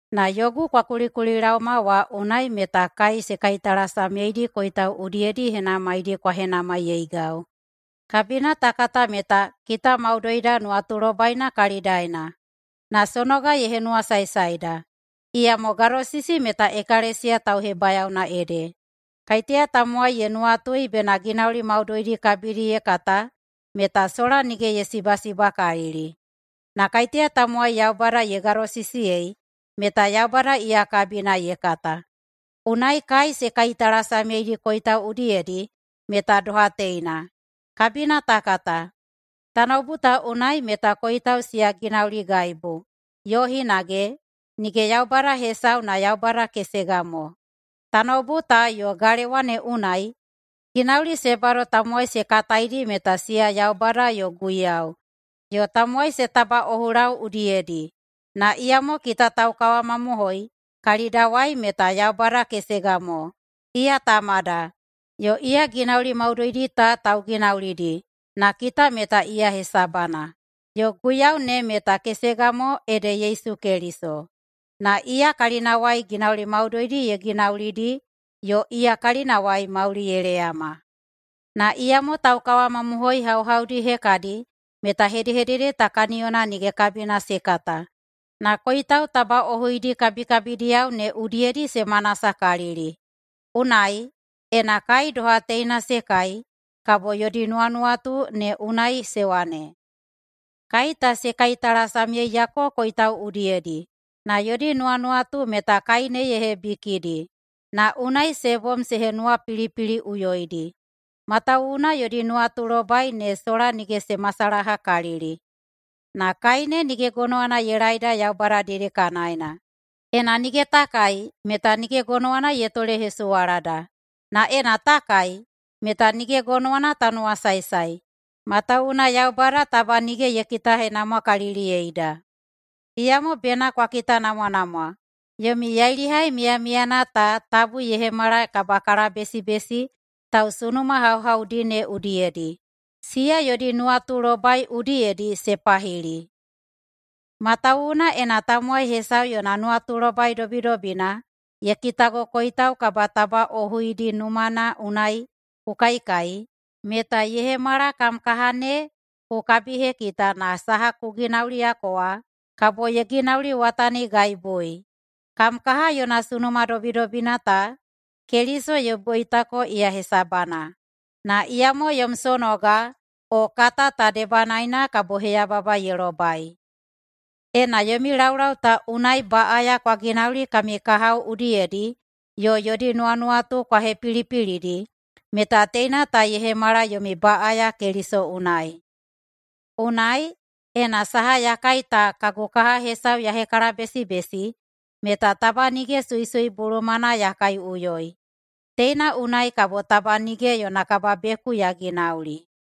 Na yogu kwa kulikulilaoma wa unai meta kai se kaitalasamyeidi koitau udiyedi henamaidi kwa henamaiyeigau. Kabina ta kata meta “kita maudoida nuwatulobaina kalidaena”. Na sonoga ye henuwasaesaeda, iyamo gadosisi meta ekalesiya tauhebayaona ede. Kaiteya tamowai ye nuwatui bena ginauli maudoidi kabidi ye kata meta sola nige ye sibasibakalili. Na kaiteya tamowai Yaubada ye gadosisiyei meta Yaubada iya kabina ye kata. Unai kai se kaitalasamyeidi koitau udiyedi meta doha teina. Kabina ta kata, “Tanoubu ta unai meta koitau siya ginauligaibu”, yo hinage, “Nige yaubada hesau na Yaubada kesega mo.” Tanoubu ta yo galewa ne unai ginauli se bado tamowai se kataidi meta siya yaubada yo guiyau, yo tamowai se tabaꞌohulau udiyedi. Na iyamo kita taukawamamohoi kalidawai meta Yaubada kesega mo, iya Tamada, yo iya ginauli maudoidi ta tauginaulidi, na kita meta iya hesabana. Yo Guiyau ne meta kesega mo ede Yesu Keliso, na iya kalinawai ginauli maudoidi ye ginaulidi yo iya kalinawai mauli ye leyama. Na iyamo taukawamamohoi hauhaudi hekadi meta hedehedede ta kaniyona nige kabina se kata, na koitau tabaꞌohuidi kabikabidiyao ne udiyedi se manasakalili. Unai, ena kai doha teina se kai, kabo yodi nuwanuwatu ne unai se wane, “Kai ta se kaitalasamyeiyako koitau udiyedi.” Na yodi nuwanuwatu meta kai ne ye hebikidi, na unai se bom se henuwapilipiliꞌuyoidi, matawuwuna yodi nuwatulobai ne sola nige se masalahakalili. Na kai ne nige gonowana ye laeida Yaubada dedekanaena. Ena nige ta kai meta nige gonowana ye tolehesuwalada, na ena ta kai, meta nige gonowana ta nuwasaesae, matawuwuna Yaubada taba nige ye kitahenamwakaliliyeida. Iyamo bena kwa kitanamwanamwa yomi yailihai miyamiyana ta tabu ye hemala kabakalabesibesi tausunuma hauhaudi ne udiyedi, siya yodi nuwatulobai udiyedi se pahili. Matawuwuna ena tamowai hesau yona nuwatulobai dobidobina ye kitago koitau kabatabaꞌohuidi numana unai ku kaikai, meta ye hemala kam kaha ne ku kabihekita na saha ku ginauliyako wa kabo ye ginauliwatanigaibui. Kam kaha yona sunuma dobidobina ta, Keliso ye boitako iya hesabana, na iyamo yom sonoga o kata ta debanaena kabo heyababa ye lobai. Ena yomi laulau ta unai baꞌaya kwa ginauli kami kahao udiyedi yo yodi nuwanuwatu kwa hepilipilidi meta teina ta ye hemala yomi baꞌaya Keliso unai. Unai, ena saha ya kai ta kagu kaha hesau ye hekalabesibesi, meta taba nige suisui bulumana ya kaiꞌuyoi. Teina unai kabo taba nige yona kababeku ya ginauli.